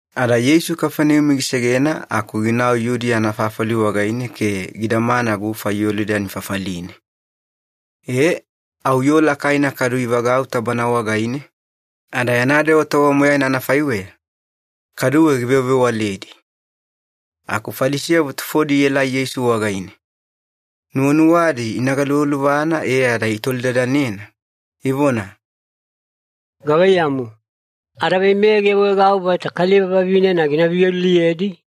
Ada Yeisu Kafaneumi gisegena aku ginau Yudiya anafafali wagaine ke gidamana gufa Yolidani fafaline. E au yoo lakaina kadu ivagauta Bana wagaine, ada yana dewa tova moyaina anafaiweya, kaduwe givewavewaledi. Aku Falisiyavo tufodi ielai Yeisu wagaine. Nuwanuwadi ina galuvaluvana e ada itolidadanena, ivona, “Gavaiyamu, adaveimeya giawaegau vaita kaliva vavinena gina viyoliliyedi?”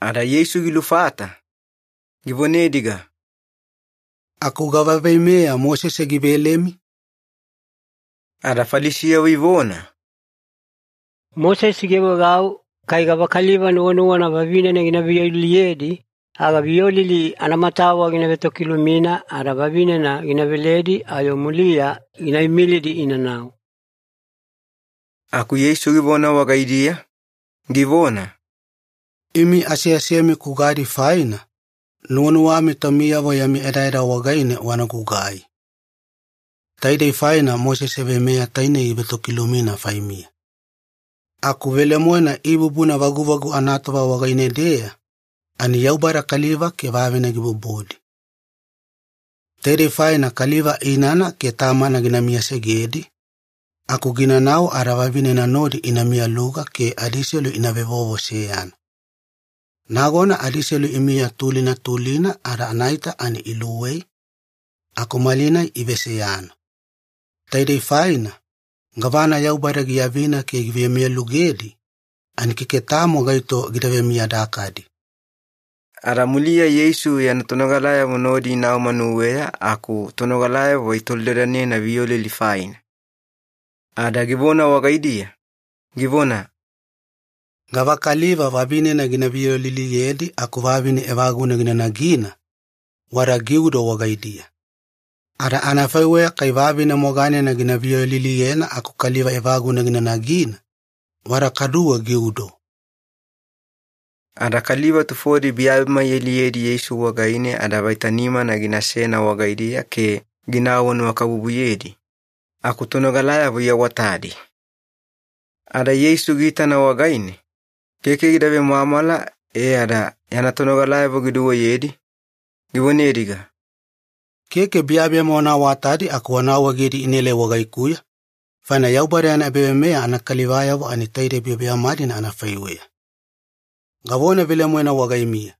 Ada Yeisu gilufata, givonediga, “Aku gava veimeya Mosese givelemi?” Ada Falisiyavo ivona, “Mosese giawaegau kai gavakaliva nuwanuwana vavinena gina viyoliliyedi, aga viyolili anamatawa gina vetokilumina ada vavinena gina veledi ayo muliya gina imilidi inanau.” Aku Yeisu givona wagaidiya, givona, “Imi aseasemi kugadi faina, nuwanuwami taumiyavo yami edaeda wagaine wana gugai. Taidei faina Mosese veimeya tainei givetokilumina faimiya. Aku velemoena ibubuna vaguvagu anatova wagaine-deya, ani ‘Yaubada kaliva ke vavine gibubudi.’ ‘Taidei faina kaliva inana ke tamana gina miyasegedi, aku ginanau ada vavinena nodi ina miyaluga ke adiselu ina vevovo seyana.’ Nagona adiselu imiya tulina tulina ada anaita ani iluwei, aku malinai iveseyana. Taidei faina, gavana Yaubada giavina ke givemiyalugedi, ani keke tamo gaito gida vemiyadakadi.” Ada muliya Yeisu yana tonogalayavo nodi inau manuweya aku tonogalayavo itolidadanena viyolili faina. Ada givona wagaidiya, givona, “Gavakaliva vavinena gina viyoliliyedi aku vavine evaguna gina nagina, wada giudo wagaidiya. Ada anafaiweya kai vavine moganena gina viyoliliyena aku kaliva evaguna gina nagina, wada kaduwe giudo.” Ada kaliva tufodi biyabiyama ialiyedi Yeisu wagaine ada vaita nimana ginasena wagaidiya ke gina awanuwakabubuyedi, aku tonogalayavo iawatadi. Ada Yeisu giitana wagaine, keke gida vemwamwala e ada yana tonogalayavo giduweyedi, givonediga, “Keke biyabiyama wana awatadi aku wana awaegedi inaelai wagaikuya, faina Yaubada yana ebaveimeya anakalivayavo ani taide biyabiyama-dina anafaiweya. Gavona velemoena wagaimiya,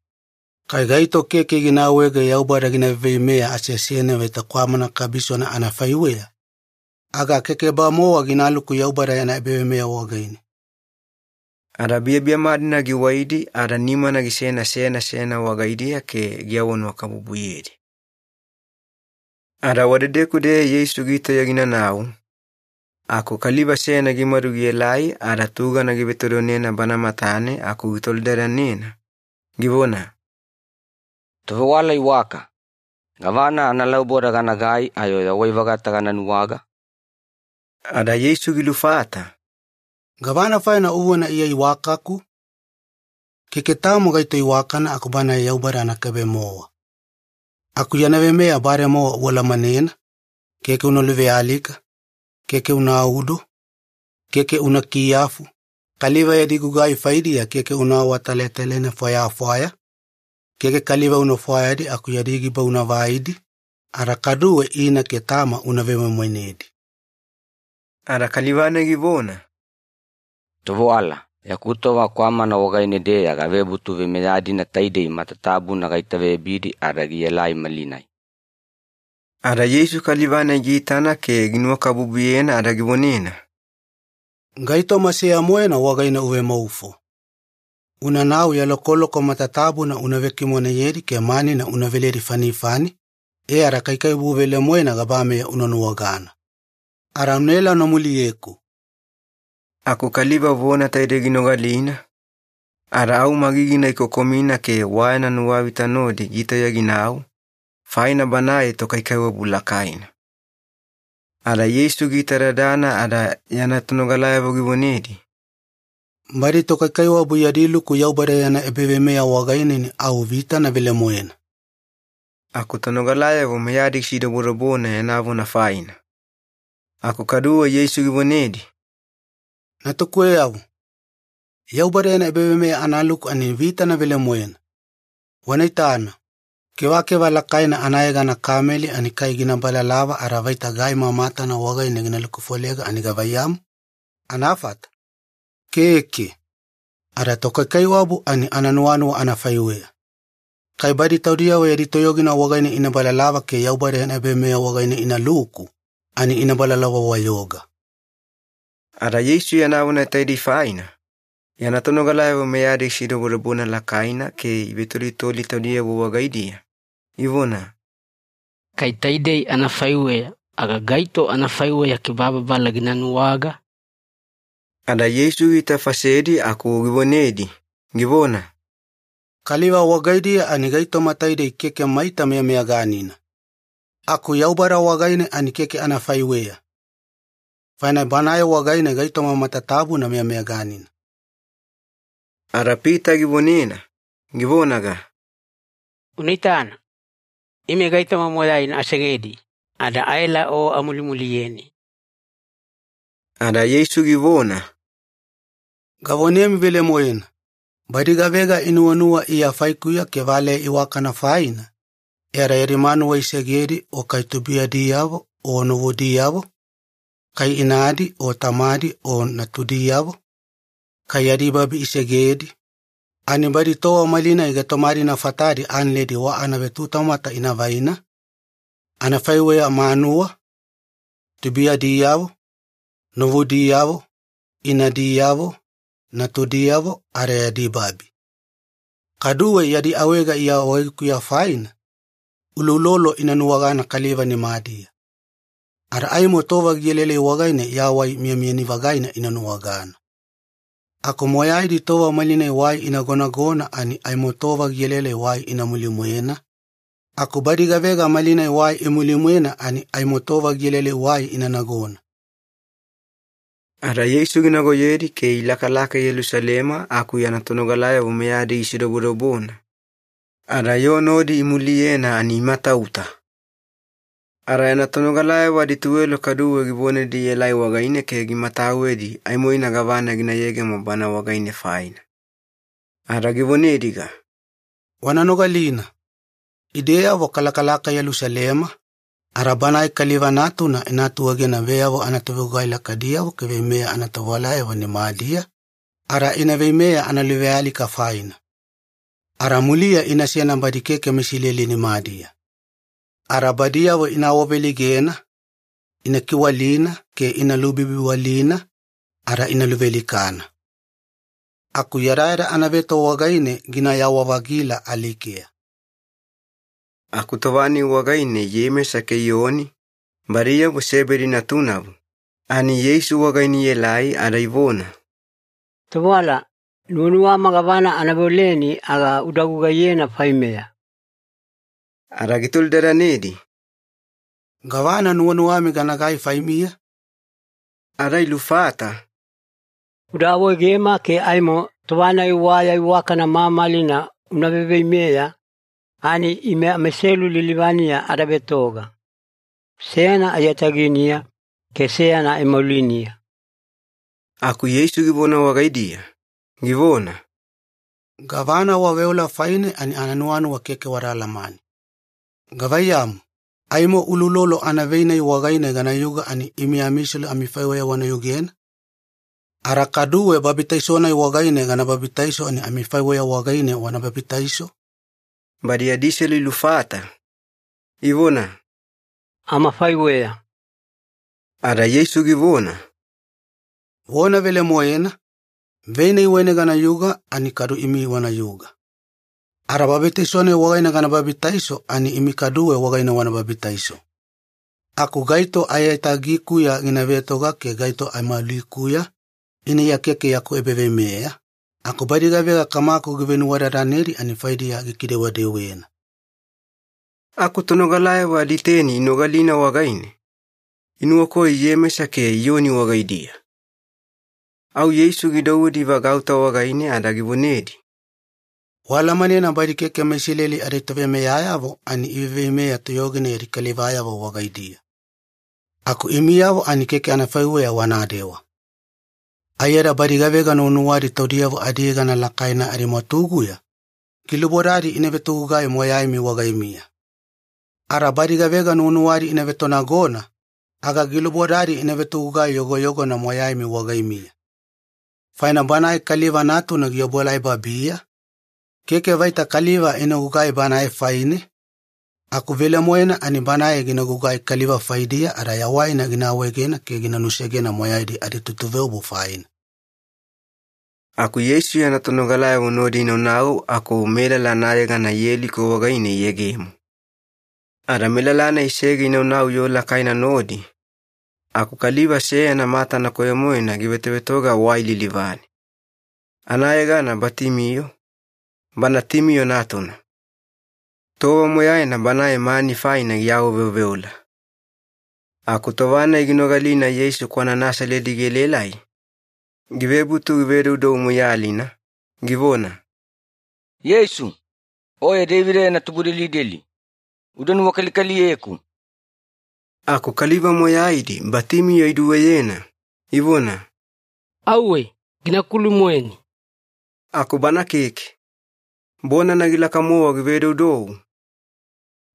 kai gaito keke gina awaege Yaubada gina veiveimeya aseasene vaita kwamana kabisona anafaiweya, aga keke-bamowa ginaluku Yaubada yana ebaveimeya wagaine.” Ada biyabiyama-dina giwaidi ada nimana gisena seyana seyana wagaidiya ke giawanuwakabubuyedi. Ada wadedeku-deya Yeisu gitauya ginanau, aku kaliva seyana gimadu gielai ada tugana givetodonena Bana matane aku gitolidadanena, givona, “Tovewala iwaka, gavana analauboda ganagai ayo yawai-vagata gana nuwaga?” Ada Yeisu gilufata, “Gavana faina uvona Iya iwakaku? Keke tamo gaito iwakana aku Banae Yaubada anakaibe-mowa. Aku yana veimeya bademowa ualamanena, ‘Keke una luvealika, keke unaudo, keke una kiyafu, kaliva yadi gugai faidiya keke una awatalatalaina fwayafwaya, keke kaliva una fwayadi aku yadi giba una vaidi, ada kaduwe ina ke tama una vemoimoinedi.’” Ada kaliva-nai givona, “Tovewala, yaku tova kwamana wagaine-deya gavebutu veimeya-dina taidei matatabuna gaitaveyabidi ada gielai malinai.” Ada Yeisu kaliva-nai giitana ke ginuwakabubuyena ada givonena, “Gaitoma seya-moena wagaine o uvemaufo. Unanau ya lokoloko matatabuna una vekimoneyedi ke manina una veledi fanifani, e ada kaikaiwabu velemoena gabameya una nuwagana. Ada unaela una muliyeku.” Aku kaliva vona taidei ginogalina, ada au magigina gikokomina ke wa yana nuwavita nodi gitauya ginau, faina banae tokaikaiwabu lakaina. Ada Yeisu giitadadana ada yana tonogalayavo givonedi, “Badi tokaikaiwabu yadi luku Yaubada yana ebaveimeya wagaine, ani au vitana velemoena.” Aku tonogalayavo meyadi gisidobodobona yana vona faina. Aku kaduwe Yeisu givonedi, “Natukuweyavo, Yaubada yana ebaveimeya analuku ani vitana velemoena! Wana itana, kevakeva lakaina anayegana kameli ani kai gina balalava ada vaita gaima matana wagaine gina lukufolega ani gavaiyamu, anafata? Keke. Ada tokaikaiwabu ani ananuwanuwa anafaiweya. Kai badi taudiyavo yadi toyogina wagaine ina balalava ke Yaubada yana ebaveimeya wagaine inaluku, ani ina balalava-wayoga.” Ada Yeisu yana vona taidei faina, yana tonogalayavo meyadi gisidobodobona lakaina ke ivetolitoli taudiyavo wagaidiya, ivona, “Kai taidei anafaiweya, aga gaito anafaiweya kibababala gina nuwaga?” Ada Yeisu giitafasedi aku givonedi, givona, “Kaliva wagaidiya ani gaitoma taidei keke maita meyameyaganina, aku Yaubada wagaine ani keke anafaiweya. Faina Banae wagaine gaitoma matatabuna meyameyaganina.” Ada Pita givonena, givonaga, “Una itana, ime gaitoma moyaina asegedi ada aela O amulimuliyeni.” Ada Yeisu givona, “Gavonemi velemoena, badi gavega inuwanuwa Iya faikuya ke valeya iwakana faina, e ada yadi manuwa isegedi o kai tubuiyadiyavo o novudiyavo, kai inadi o tamadi o natudiyavo, kai yadi babi isegedi, ani badi tova malinai gaitoma-dina fatadi analedi wa anavetutamwata ina vaina, anafaiweya manuwa, tubuiyadiyavo, novudiyavo, inadiyavo, natudiyavo, ada yadi babi. Kaduwe yadi awaega Iya wagaikuya faina, uloulolo ina nuwagana kaliva nimadiya. Ada aimo tova gielaelai wagaine yawai miyamiyani-vagaina ina nuwagana. Aku moyaidi tova malinai wai inagonagona ani aimo tova gielaelai wai ina muline-mwena, aku badi gavega malinai wai imuli-mwena ani aimo tova gielaelai wai ina nagona.” Ada Yeisu ginagoyedi ke ilakalaka Yelusalema aku yana tonogalayavo meyadi gisidobodobona, ada yoo nodi imuliyena ani imatauta. Ada yana tonogalayavo adituwelo kaduwe givonedi ielai wagaine ke gimatawedi aimoina gavana gina yegemo Bana wagaine faina. Ada givonediga, “Wana nogalina. Ideyavo kalakalaka Yelusalema, ada Banae Kaliva Natuna ina atuegena veyavo anatovegugai lakaidiyavo ke veimeya anatovewalayavo nimadiya, ada ina veimeya analuvealika faina. Ada muliya inasena badi keke meIsileli nimadiya. Ada badiyavo ina awaveleigena, ina kiwalina ke ina lubibiwalina, ada ina luvealikana. Aku yadayada anaveto wagaine ginayawa-vagila alikeya.” Aku tova-nai wagaine Iyemesa ke Iyoni, badiyavo Sebedi natunavo, ani Yeisu wagaine ielai ada ivona, “Tovewala, nuwanuwama gavana ana veoleni aga uda gugaiyena faimeya.” Ada gitolidadanedi, “Gavana nuwanuwami ganagai faimiya?” Ada ilufata, “Uda awaegema ke aimo tova-nai wa ya iwakana mamalina una veiveimeya, ani ime amaiselu lilivaniya ada vetoga. Seyana aiyataginiya ke seyana aimauliniya.” Aku Yeisu givona wagaidiya, givona, “Gavana waveola faine ani ananuwanuwa keke wada alamane. Gavaiyamu, aimo uloulolo anavei-nai wagaine ganayuga ani imi amiselu amifaiweya wana yugena? Ada kaduwe babitaiso-nai wagaine gana babitaiso ani amifaiweya wagaine wana babitaiso?” Badi adiselu ilufata, ivona, “Amafaiweya.” Ada Yeisu givona, “Vona velemoena, vei-nai wagaine ganayuga ani kadu imi wanayuga. Ada babitaiso-nai wagaine gana babitaiso ani imi kaduwe wagaine wana babitaiso. Aku gaito aiyatagikuya gina vetoga ke gaito aimaulikuya, ina Iya keke yaku ebaveimeya, aku badi gavega Kamaku givenuwadadanedi ani faidiya gikidewedewena.” Aku tonogalayavo aditeni inogalina wagaine, inuwakoyo Iyemesa ke Iyoni wagaidiya. Au Yeisu gidouwedi ivagauta wagaine ada givonedi, “Waalamanena badi keke meIsileli aditoveimeyayavo ani iveiveimeya toyogina yadi kalivayavo wagaidiya. Aku imiyavo ani keke anafaiweya wanadewa. Aiyada badi gavega nuwanuwadi taudiyavo adiyegana lakaina amimwatuguya, gilubodadi ina vetogugai moyaimi wagaimiya. Ada badi gavega nuwanuwadi ina vetonagona, aga gilubodadi ina vetogugai yogoyogona moyaimi wagaimiya. Faina Banae Kaliva Natuna giobuelai babiya, keke vaita kaliva ina gugai Banae faine, aku velemoena ani Banae gina gugai kaliva faidiya ada yawaina gina awaegena ke gina nusegena moyaidi aditutuveobu faina.” Aku Yeisu yana tonogalayavo nodi inaunau aku melala anayegana Yeliko wagaine iyegemo. Ada melala-nai isege inaunau yoo lakaina nodi, aku kaliva seyana matana koyo-moena givetovetoga wai lilivane. Anayegana Batimiyo, bana Timiyo natuna. Tova moyaina banae mani faina giawaveoveola. Aku tova-nai ginogalina Yeisu kwana Nasaledi gielaelai, givebutu givedoudou moiyalina, givona, “Yeisu, Oye Deivida yana tubudelideli, uda nuwakalikaliyeku!” Aku kaliva moyaidi Batimiyo iduweyena, ivona, “Auwe! Gina kulu-moeni!” Aku bana keke. Bonana gilaka-mowa givedoudou,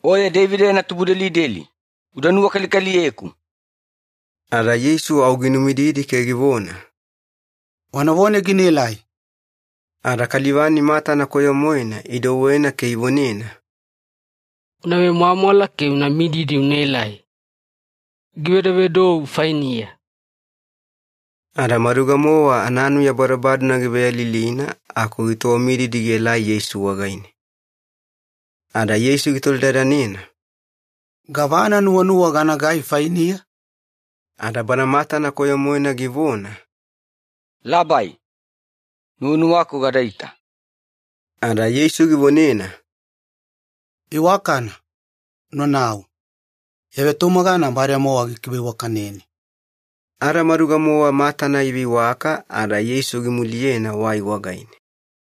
“Oye Deivida yana tubudelideli, uda nuwakalikaliyeku!” Ada Yeisu au ginumididi ke givona, “Wanavone ginaelai.” Ada kaliva-nai matana koyo-moena idouwena ke ivonena, “Una vemwamwala ke una mididi unaelai! Givedovedou fainiya!” Ada maduga-mowa ananuya badobadona giveyalilina aku gitowamididi gielai Yeisu wagaine. Ada Yeisu gitolidadanena, “Gavana nuwanuwa ganagai fainiya?” Ada bana matana koyo-moena givona, “Labai, nuwanuwaku gadaita.” Ada Yeisu givonena, “Iwakana, unanau. Ya vetumagana bademowa gikiveiwakaneni.” Ada maduga-mowa matana iveiwaka ada Yeisu gimuliyena wai wagaine.